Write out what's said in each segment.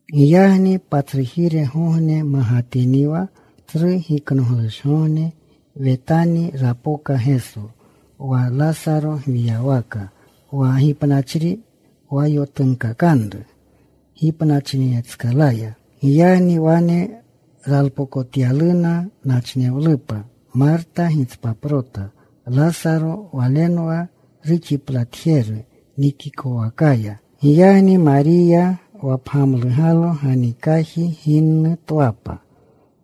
Giyagni patsrujirgogne magatiniwa Tsru Giknoglushgogne, Wetani rapoka Geso, wa Lasaro gwiywaka, wa gipnapachri wa yotunkakanru gipnachinetskalaya. Giyagni wane ralpokotyaluna nachnewlupa. Marta gitspaprota. Lasaro walenwa ruxiplatjeru nikikowakaya. Giyagni Mariya wa pgamlugalo ganikaji ginnu twapa,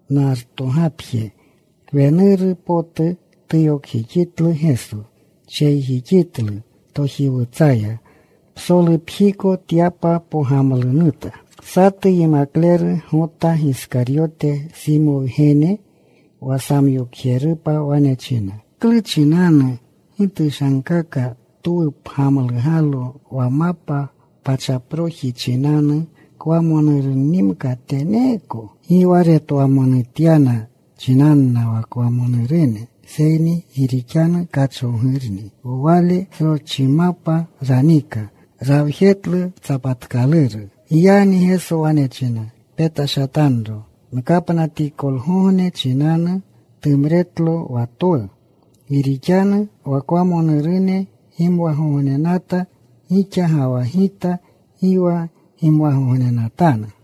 nartogapje kwenuru potu. Tuyokjixitlu Geso. Tsheyjixitlu tojiwutsaya. Psolupjiko tyapa pogamlunuta. Satu yimakleru Gota Giskaryote, Simo wgene, wa samyokjerupa, wane china, “¿Klu chinanu gi tushankaka twu pgamlugalo wa mapa pachaproji chinanu, kwamonurunnimka teneeko?” Gi wa retwamonutya chinanna wa kwamonurune, seyni gi rixanu kachowgurni wale. Sroschimapa ranika. Rawjetlu tsapatkaluru. Giyagni Geso wane china, “Petashatanro. Nkapnatikolgogne chinanu tumretlo wa twu. Gi rixanu wa kwamonurune gimwagognenata gixa, ga wa Gita gi wa gimwagognenatanu.”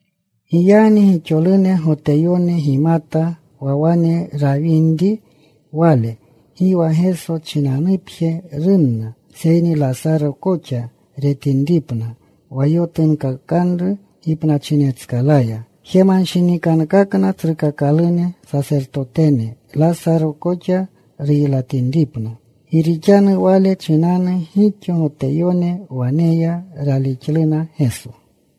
Giyagni gixolune Goteyone gimata wa wane rawinri Wale. Gi wa Geso chinanupje runna, seyni Lasaro koxa retapinripna wa yotunkakanru gipnachinetskalaya. Jemanshinikankakna tsrukakalune sasertotene, Lasaro koxa ruylatinripna. Gi rixanu wale chinanu gixo Goteyone wane ya. Ralixluna Geso.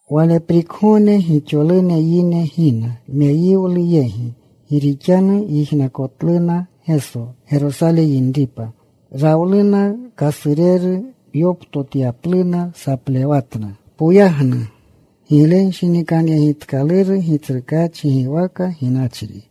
Waleprikgogne gixolune yine gina meyiwlu yegi, gi rixanu yijnakotluna Geso Gerosale yinripa. Rawluna kasureru. Yoptotapluna. Saplewatna: ¡Poyagnu! ¡Giglenshinikanyegitkaluru Gitsrukaachi giwaka ginyachri,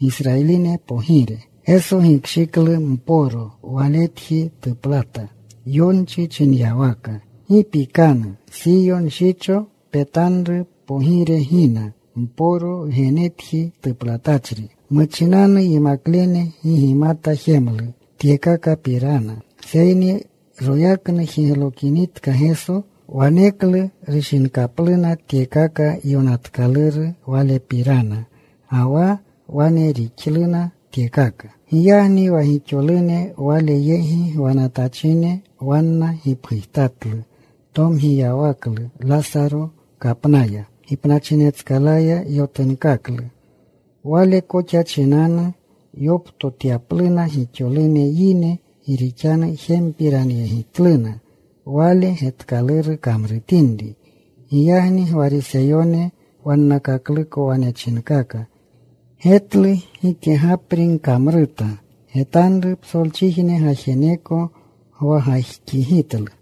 Gisrayiline Pogire! Geso gikshiklu mporo. Waletji tuplata. Yonchi chinyawaka: Gi pikanu, Siyo nshicho. Petanru. Pogire gina, mporo wgenetji tuplatachri. Muchinanu yimaklene gi gimata jemlu tyekakapirana, seyni royaknu jiglokinitka Geso, waneklu rushinkapluna tyekaka yonatkaluru Walepirana, ga wa wane rixluna tyekaka. Giyagni wa gixolune Wale yegi gwanatachine, wanna gipgujtatlu tomgiyawaklu Lasaro kapnaya. Gipnachinetskalaya yotunkaklu. Wale koxa chinanu yoptotapluna gixolune yine, gi rixanu jempiranyegitluna Wale getkaluru kamrutinri. Giyagni Gwariseyone wannakakluko wane chinkaka, “Getlu. Gikegapri gkamruta. Getanru. Psolchijne gajeneko gwagajxigitlu.”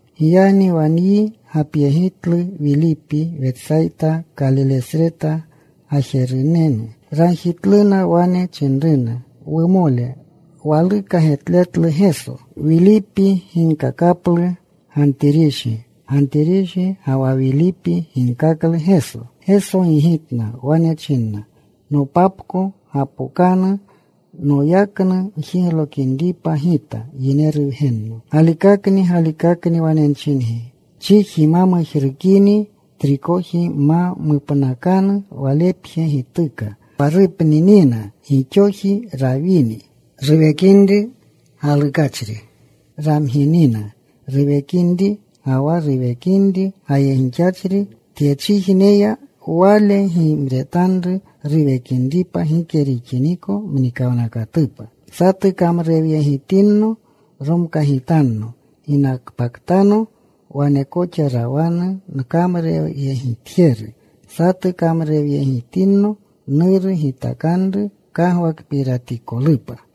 Giyagni wa nyi gapyegitlu Wilipi, Wetsayta, Kalilesreta gajerunanu. Ragjitluna. Wane chinruna, “Wumole, waluka getletlu Geso.” Wilipi ginkakaplu Gantirishi. Gantirishi ga wa Wilipi ginkaklu Geso. Geso gigitna. Wane china, “Nopapko gapokanu noyaknu njiglokinripa Gita, Yineru Wgenno. Galikakni, galikakni wane nchingi, Chiji ma mujrukini trikoji, ma mupnakanu, walepje gituka. Wa rupninina, gixoji rawini. Ruwekinri galukachri, ramginina ruwekinri, ga wa ruwekinri gayegixachri tyechijneya, wale gimretanru ruwekinripa gike rixiniko mnikawnakatupa. Satu kamrurewyegitinno, romkagitanno. Ginakpaktano, wane koxa rawanu nkamrurewyegitjeru. Satu kamrurewyegitinno, Nuru gitakanru kagwakpiratikolupa.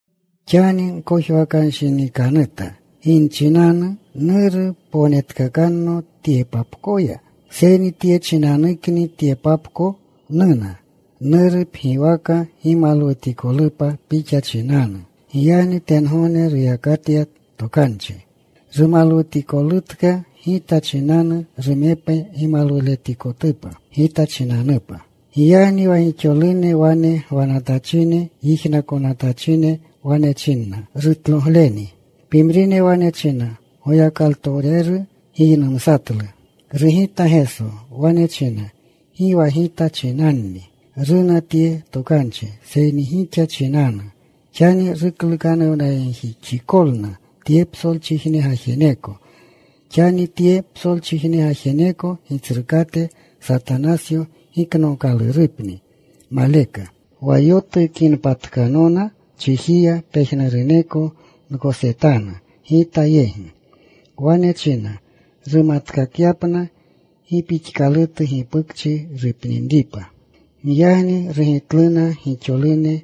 “Xani nkojwakanshinikanuta. ¿Gi nchinanu? ¿Nuru, pognetkakanno tyepapkoya? Seyni tye chinanukni tyepapko nuna. Nuru, pgiwaka gimalwutikolupa Pixa chinanu.” Giyagni tengogne ruyakatya tokanchi, “Rumalwutikolutka Gita chinanu. Rumepe gimalwutikolupa Gita chinanupa.” Giyagni wa gixolune wane gwanatachine, yijnakonatachine, wane chinna, “Rutlogleni.” Pimrine wane china, “Goyakalutowreru giynumsatlu.” Rugita Geso. Wane china, “Gi wa Gita chinanni runa tye tokanchi, seyni gixa chinanu. Xani ruklukanuwnayegjixikolna tye psolchijne gajeneko. Xani tye psolchijne gajeneko gitsrukate, Satanasyo, giknookalurupni maleka. Wa yotukinpatkanona chijiya, pejnuruneko nkosetanu Gita yegi.” Wane china rumatkakyapna gi pixkalutu gipukchi rupninripa. Giyagni rugitluna gixolune,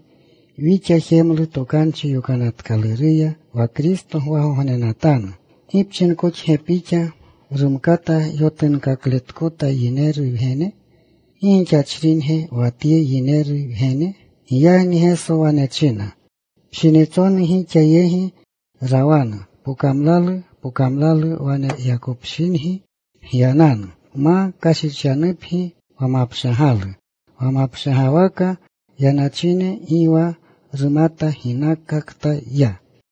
“Wixa jemlu Tokanchi Yokanatkaluruya wa Kristo gwagognenatanu. ¿Gi pchinkoxge Pixa: ‘Rumkata yotunkaakota Yineru Wgene?’ ¿Gi gixachringe wa tye Yineru Wgene?” Giyagni Geso wane chinna, “Pshinitsonu gixa yegi rawanu pokamlalu. Pokamlalu waneyakopshingi gyananu, ma kashichkanupgi wa mapshagalu. Wa mapshagwaka yanachri gi wa rumata ginakakta ya.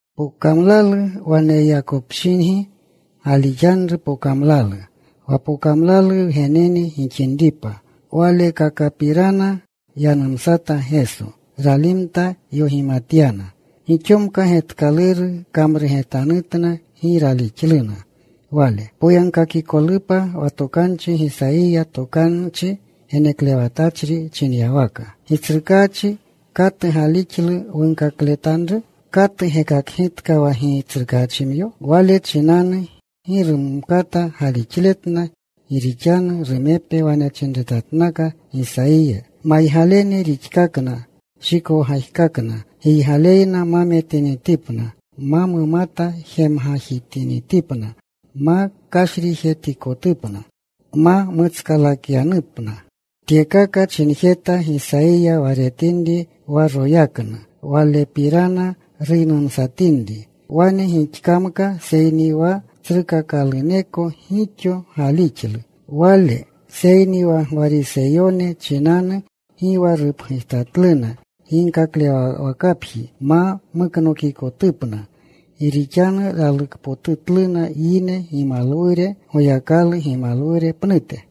“Pokamlalu waneyakopshingi galixanru pokamlalu, wa pokamlalu wgenene gixinripa.” Walekakapirana yanumsata Geso. Ralimta. Yogimatyana. Gixomka getkaluru kamrugetanutna. Gi ralixluna Wale, poyagkakikolupa wa tokanchi Gisayiya tokanchi geneklewatachri chinyawaka: Gitsrukaachi, ¿katu galixlu wunkakletanru? ¿Katu gekakgitka wa Gitsrukaachimyo? Wale chinanu gi rumkata galixletna, gi rixanu rumepe wane chinretatnaka Gisayiya: Maygalene rixkakna. Shikowgajkakna. Giygaleyna ma metinitipna. Ma mumata jemgajitinipna ma kashrijetikotupna. Nma mutskalakyanupna. Tyekaka chinjeta Gisayiya wa retinri wa royaknu, Walepirana ruynumsatinri. Wane gixkamka, seyni wa tsrukakaluneko gixo galixlu Wale, seyni wa Gwariseyone chinanu gi wa rupgujtatluna, ginkaklewwakapji ma muknokikotupna. Gi rixanu ralukpotutluna yine gimalwure Goyakalu gimalwure pnute.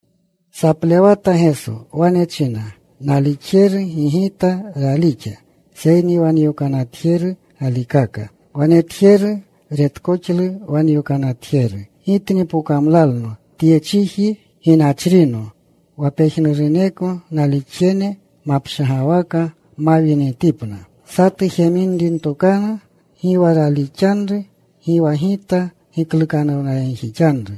Saplewata Geso. Wane china, “Nalixjeru gi Gita ralixa seyni wa nyokanatjeru galikaka. Wa netjeru retkoxlu wa nyokanatjeru. Gitni pokamlalno tye chiji ginachrino wa pejnuruneko nalixjene mapshagwaka mawinitipna. “Satu jeminri ntokanu, gi wa ralixanru, gi wa Gita giklukanuwnayegjixanru.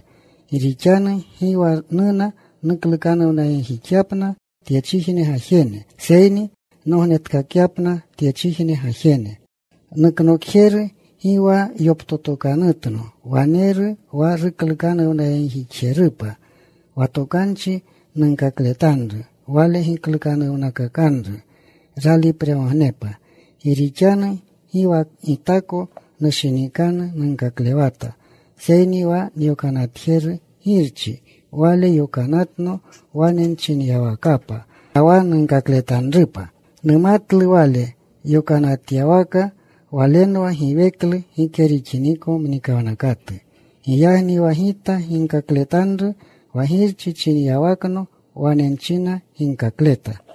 Gi rixanu gi wa nuna nuklukanuwnayegjixyapna tyechijne gajene, seyni nognetkakyapna tyechijne gajene. Nuknokjeru, gi wa yoptotokanutno, waneru wa ruklukanuwnayegjixjerupa. Wa tokanchi nunkakletanru, wale giklukanuwnakakanru ralipregognepa. Gi rixanu gi wa Gitako nushinikanu nunkaklewata, seyni wa nyokanatjeru Girchi, Wale yokanatno wane nchinyawakapa, ga wa nunkakletanrupa. Numatlu Wale yokanatyawaka Walenwa giweklu gike rixiniko mnikawnakatu. Giyagni wa Gita ginkakletanru wa Girchi chinyawakno, wane nchina ginkakleta.”